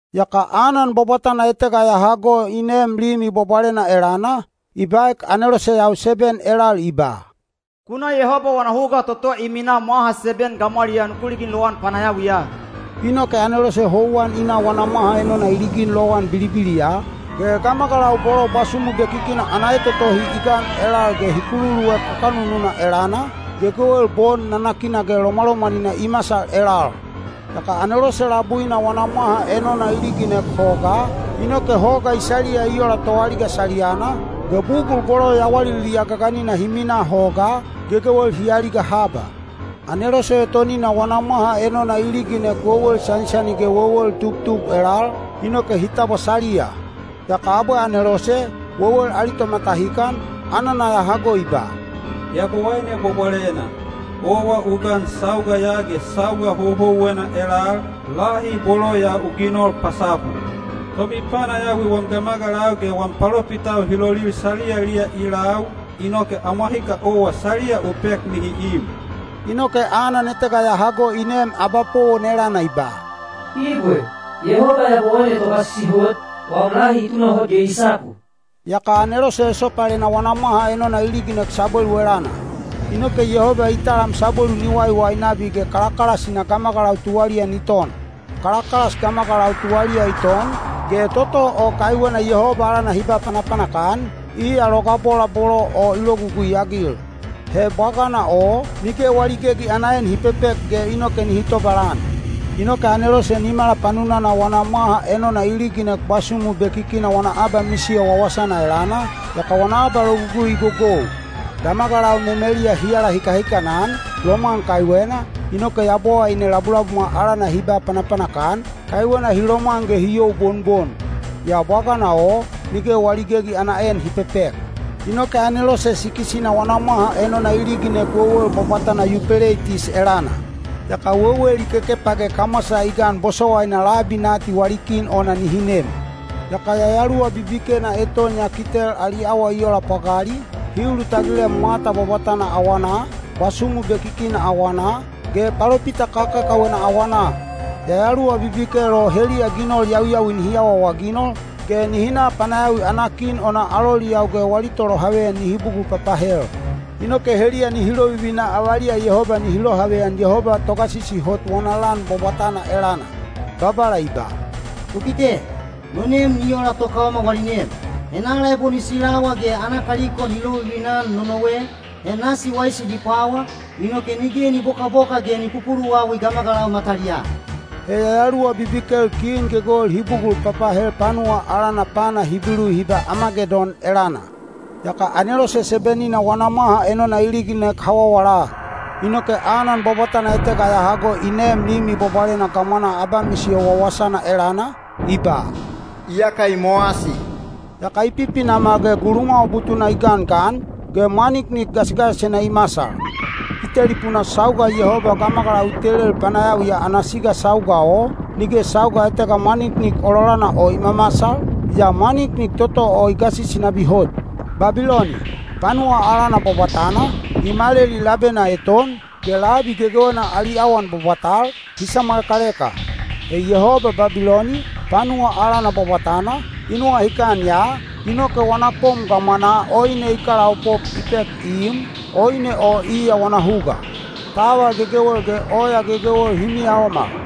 Yaka anan bwabwatana etega ya hago i neem Limi Bwabwalena elana, i baek aneloseyau seben elal i ba, “Ku na Yehoba wana huga toto i minaa mwaha seben gamwaliyaa ku ligin lowan panayawiya.” Inoke anelose houwan i na wana mwaha enona i ligin lowan bilibiliya, ge gamagalau bolo bwasumu bekikina ana etotohi i gan elal ge hi kululuek kakanununa elana, gegewel bon nanakina ge lomwalomwanina i masal elal. Yaka anelose labuina wana mwaha enona i liginek hogaa, inoke hoga i saliya i ola toaliga saliyana, ge bugul bolo yawaliliya gaganina hi minaa hogaa, gegewel hi aliga haba. Anelose etonina wana mwaha enona i liginek wewel sanisani ge wewel tubtub elal, inoke hi tabwa saliya. Yaka abwe anelose, wewel ali tomatahikan, anana ya hago i ba, “Yabowaine Bwabwalena, owa u gan sauga ya ge sauga houhouwena elal, lahi bolo ya u ginol pasapu. Tomipanayawi wam gamagalau ge wam palopitau hi lolil saliyaliya i lau, inoke amwahika owa saliya u pek nihi im.” Inoke anan etega ya hago i neem abapowon elana i ba, “Ibwe, Yehoba Yabowaine Togasisi Hot, wam lahi i tunahot ge i sapu.” Yaka anelose esopalena wana mwaha enona i liginek sabwelu elana. Inoke Yehoba i talam sabwelu ni waiwai nabi ge kalakalasina gamagalau tuwaliya ni ton. Kalakalas gamagalau tuwaliya i ton, ge toto o kaiwena Yehoba alana hi ba panapanak-an, iya logabola bolo o i logugui-agil. He bwagana o, nige wali gegi ana en hi pepek ge inoke nihi tobalan. Inoke anelose nimala panunana wana mwaha enona i liginek bwasumu bekikina wana abamisiyo wawasana elana, yaka wana abalogugui i gogou. Gamagalau memeliya hi alahikahikanan, lomwan kaiwena, inoke Yabowaine labulabumwa alana hi ba panapanak-an, kaiwena hi lomwan ge hi youbonbon. Yaa bwagana o, nige wali gegi ana en hi pepek. Inoke anelose sikis-ina wana mwaha enona i liginek wewel bwabwatana Yupeleitis elana. Yaka wewel i kekepa ge kamwasa i gan bosowaina labi nati wali kin ona nihi nem. Yaka yayaluwa bibikena eton ya kitel ali awa i ola pwagali, hi ulutagilem mwata bwabwatana awanaa, bwasumu bekikina awanaa, ge palopita kakakawena awanaa. Yayaluwa bibikel o heliya ginol yawiyawi nihi awaawaginol, ge nihi na panayawi ana kin ona aloliyau ge wali tolohaveyan nihi bugul papahel. Inoke heliya nihi lovivina avaliya Yehoba nihi lohaveyan Yehoba Togasisi Hot wana lan bwabwatana elana. Babala i ba, “Ku kite! No nem ni ola tokaoma wali nem! Henala ebo ni silawa ge ana kaliko ni lovivina-an nonowe, he nasi waisi ni pwawa, inoke nige ni bokaboka ge ni pupuluwawi gamagalau mataliyaa.” He yayaluwa bibikel kin gegewel hi bugul papahel panuwa alana pana Hibilu hi ba Amagedon elana. Yaka anelose seben-ina wana mwaha enona i liginek hawawala. Inoke anan bwabwatana etega ya hago i neem Limi Bwabwalena gamwanaa abamisiyo wawasana elana, i ba, “Iyaka i mowasi.” Yaka i pipinamal ge gulumwawa butuna i gangan, ge mwaniknik gasigasisena i masal. I telipunaa sauga Yehoba gamagalau i telel panayawiya ana siga sauga o, nige sauga etega mwaniknik ololana o i mamasal, yaa mwaniknik toto o i gasisi nabi hot. Babiloni, panuwa alana bwabwatana, i maleli labena eton, ge labi gegewena ali awan bwabwatal, hi samwalekaleka. He Yehoba Babiloni, panuwa alana bwabwatana, i nuwahikan ya, inoke wana kom gamwanaa oine i kalaopop i pek i im, oine o iya wana huga. Taval gegewel ge oya gegewel hi miyaomal.